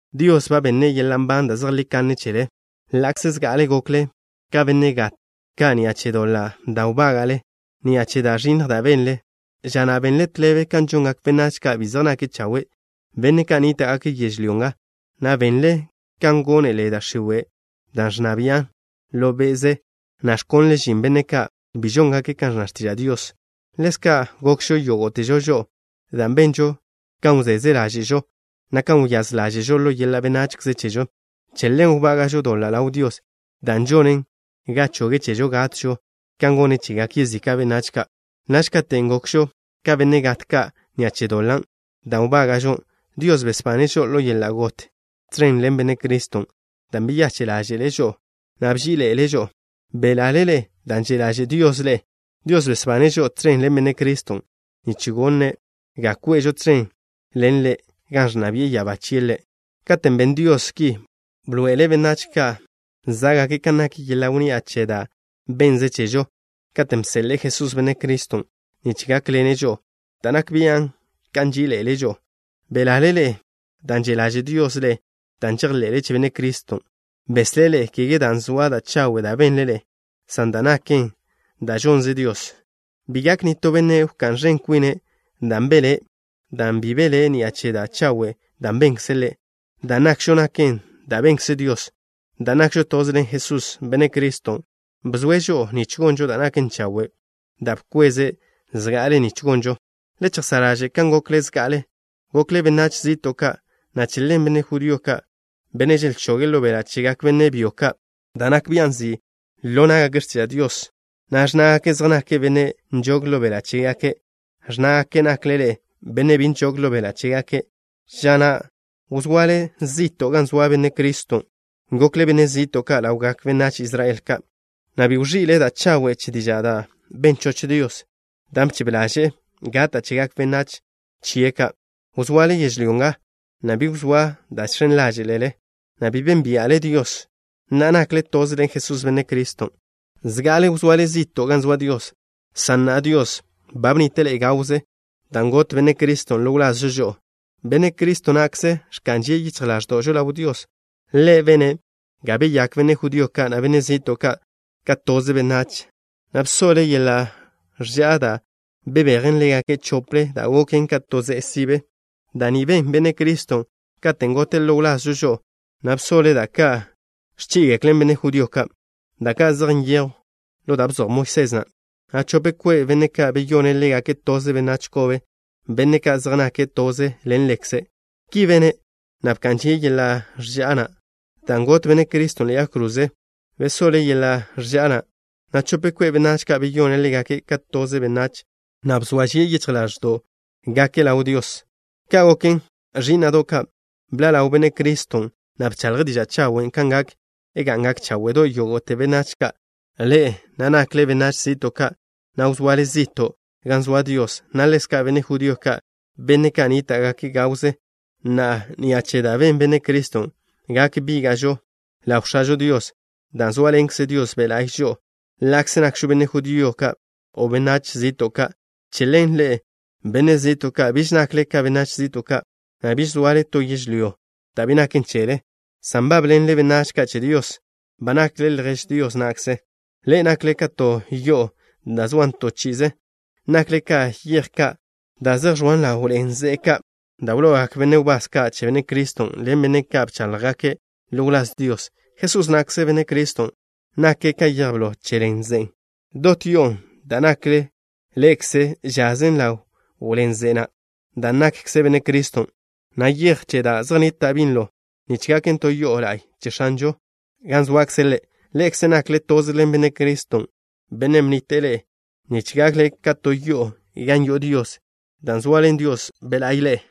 Dios ba benne' yeḻa' nban da' zejlí kanne chele, ḻa'kze zga'ale gokle ka benne' gat ka' ni'a che doḻa' da' wbága'le, na' ni'a che da' ẕinnj da' benle. Ža na' benle tḻebe kan žongak benách ka' bi zej nake' chawe', benne' ka' nníta'gake' yežlyó nga, na' benle kan gónele da' x̱iwe', dan' ẕnna bian' ḻo be'ze, na' ẕkonlen žin benne' ka' bi žóngake' kan ẕnna x̱tiža' Dios. Ḻezka' gokžo yógo'težo žo'o, dan' benžo kan wzeze ḻáže'žo, na' kan wyáz ḻáže'žo ḻo yeḻa' benachze chežo. Che ḻen wbága'žo doḻa' ḻaw Dios, dan' žonen ga choge' chežo gatžo kan gone' chegak yezika' benách ka'. Naž katen' gokžo ka benne' gat ka' ni'a che doḻan' da' wbága'žo, Dios besbane' žo'o ḻo yeḻa' got tẕen ḻen Benne' Criston' dan' beyache' ḻáže'le' žo'o, na' bží'iḻe'ele' žo'o. Belale ḻe'e dan' že' ḻaže' Dios ḻe'e. Dios besbane' žo'o tẕen ḻen Benne' Criston' nich gone' ga kwe'žo tẕen ḻen Ḻe' gan ẕnna bi'e ya'abá chie' Ḻe'. Katen' ben Dios ki, bḻoe'ele' benách ka' zá'gake' kan nak yeḻa' wnni'a che da' bennze' chežo, katen' bseḻe'e Jesús, Benne' Criston', nich gákḻene' žo'o, da' nak bian' kan nží'iḻe'ele' žo'o. Belale ḻe'e dan' že' ḻaže' Dios ḻe'e dan' žejḻe'le che Benne' Criston'. Beslé' ḻe'e, kege dan' zoa da' chawe' da' benle ḻe'e, san dan' naken da' žonze Dios. Bi gak nitó benne' wká'n ẕen kwine' dan' belé', dan' bi belé' ni'a che da' chawe' da' benkze' ḻe'. Da' nakžo naken da' benkze Dios. Dan' nakžo toze ḻen Jesús, Benne' Criston', bzoe' žo'o nich gonžo da' naken chawe', da' bkweze' zga'ale nich gonžon. Le chejsá' ḻaže' kan gokle zga'ale. Gokle benách zi'to' ka', na' che ḻen benne' judío ka', benne' želchoge' ḻo beḻa' chegak benne' byo ka' da' nak bian' nzi' ḻo ná'gake' x̱tiža' Dios, na' ẕnnágake' zej nake' benne' nžog ḻo beḻa' chégake', ẕnnágake' nakle ḻe'e benne' bi nžog ḻo beḻa' chégake'. Ža na' wzoale zi'to' gan zoa Benne' Criston'. Gokle benne' zi'to' ka' ḻawgak benách Israel ka', na' bi wẕi'le da' chawe' che diža' da' ben choch Dios, dan' bchebe ḻaže'e gata' chegak benách chie' ka'. Wzoale yežlyó nga, na' bi wzóa da' žx̱en ḻáže'le, na' bi bénbia'le Dios. Na'a, nakle toze ḻen Jesús, Benne' Criston'. Zga'ale wzoale zi'to' gan zoa Dios, san na'a Dios ba bnnite' ḻe'e gawze dan' got Benne' Criston' ḻo wlazžo žo'o. Benne' Cristo na'kze ẕka'n žie' yichj ḻáẕdo'žo ḻaw Dios. Ḻe' bene' ga beyakgak benne' judío ka', na' benne' zi'to' ka', ka toze benách, na' bsoḻe' yeḻa' ẕža'a dan' bebejen ḻégake' chople, dan' goken ka to ze'e sibe. Da' ni ben Benne' Criston' katen' gote' ḻo wlazžo žo'o, na' bsoḻe' da' ka' ẕchí'igeklen benne' judío ka', da' ka' zej nyejwn ḻo da' bzoj Moisés na', na' chope kwe' benne' ka', beyone' ḻégake' toze benách kobe, benne' ka' zej nake' toze ḻen Ḻekze'. Ki bene', na' bka'n žie' yeḻa' ẕža'a na'. Dan' got Benne' Criston' ḻe'e yag kroze, bsoḻe' yeḻa' ẕža'a na', na' chope kwe' benách ka', beyone' ḻégake' ka toze benách, na' bzoa žie' yichj ḻáẕdo'gake' ḻaw Dios. Ka' goken, ẕí'na'do' ka', bḻa' ḻaw Benne' Criston', na' bchaḻje' diža' chawen' kan gak ga'ngak cháwe'do' yógo'te benách ka', ḻe'e na' nakle benách zi'to' ka', na' wzoale zi'to' gan zoa Dios, na' ḻezka' benne' judío ka', benne' ka' nníta'gake' gawze. Na'a, ni'a che da' ben Benne' Criston', gak bíga'žo ḻaw X̱ažo Dios, dan' zóaḻenkze Dios Be' La'y žo'o, ḻa'kze nakžo benne' judío ka' o benách zi'to' ka'. Che ḻen, ḻe'e, benne' zi'to' ka', biž nakle ka benách zi'to' ka', na' biž zoale to yežlyó da' bi naken chele, san nbábḻenle benách ka' che Dios. Ba nakle ljež Dios na'kze. Ḻe'e nakle ka to yo'o da' zoan to chi'ize. Nakle ka yej ka' da' zej ẕoan ḻaw ḻen ze'e, da' wlo'ogak benne' wbás ka' che Benne' Criston' ḻen benne' ka' bcháḻjgake' ḻo wláz Dios. Jesús na'kze, Benne' Criston', nake' ka yej blo che ḻen ze'e na'. Dot yo'on' da' nakle ḻe'ekze žasen ḻaw ḻen ze'e na', dan' nakkze Benne' Criston', na' yej chen ka' zej nnita' binlo, nich gaken to yodo' la'y che X̱anžon' gan zoakze' Ḻe'. Ḻe'ekze nakle toze ḻen Benne' Criston', Bennen' bnnite' ḻe'e nich gakle ka to yo'o gan yo'o Dios, dan' zoaḻen Dios Be' la'y ḻe'e.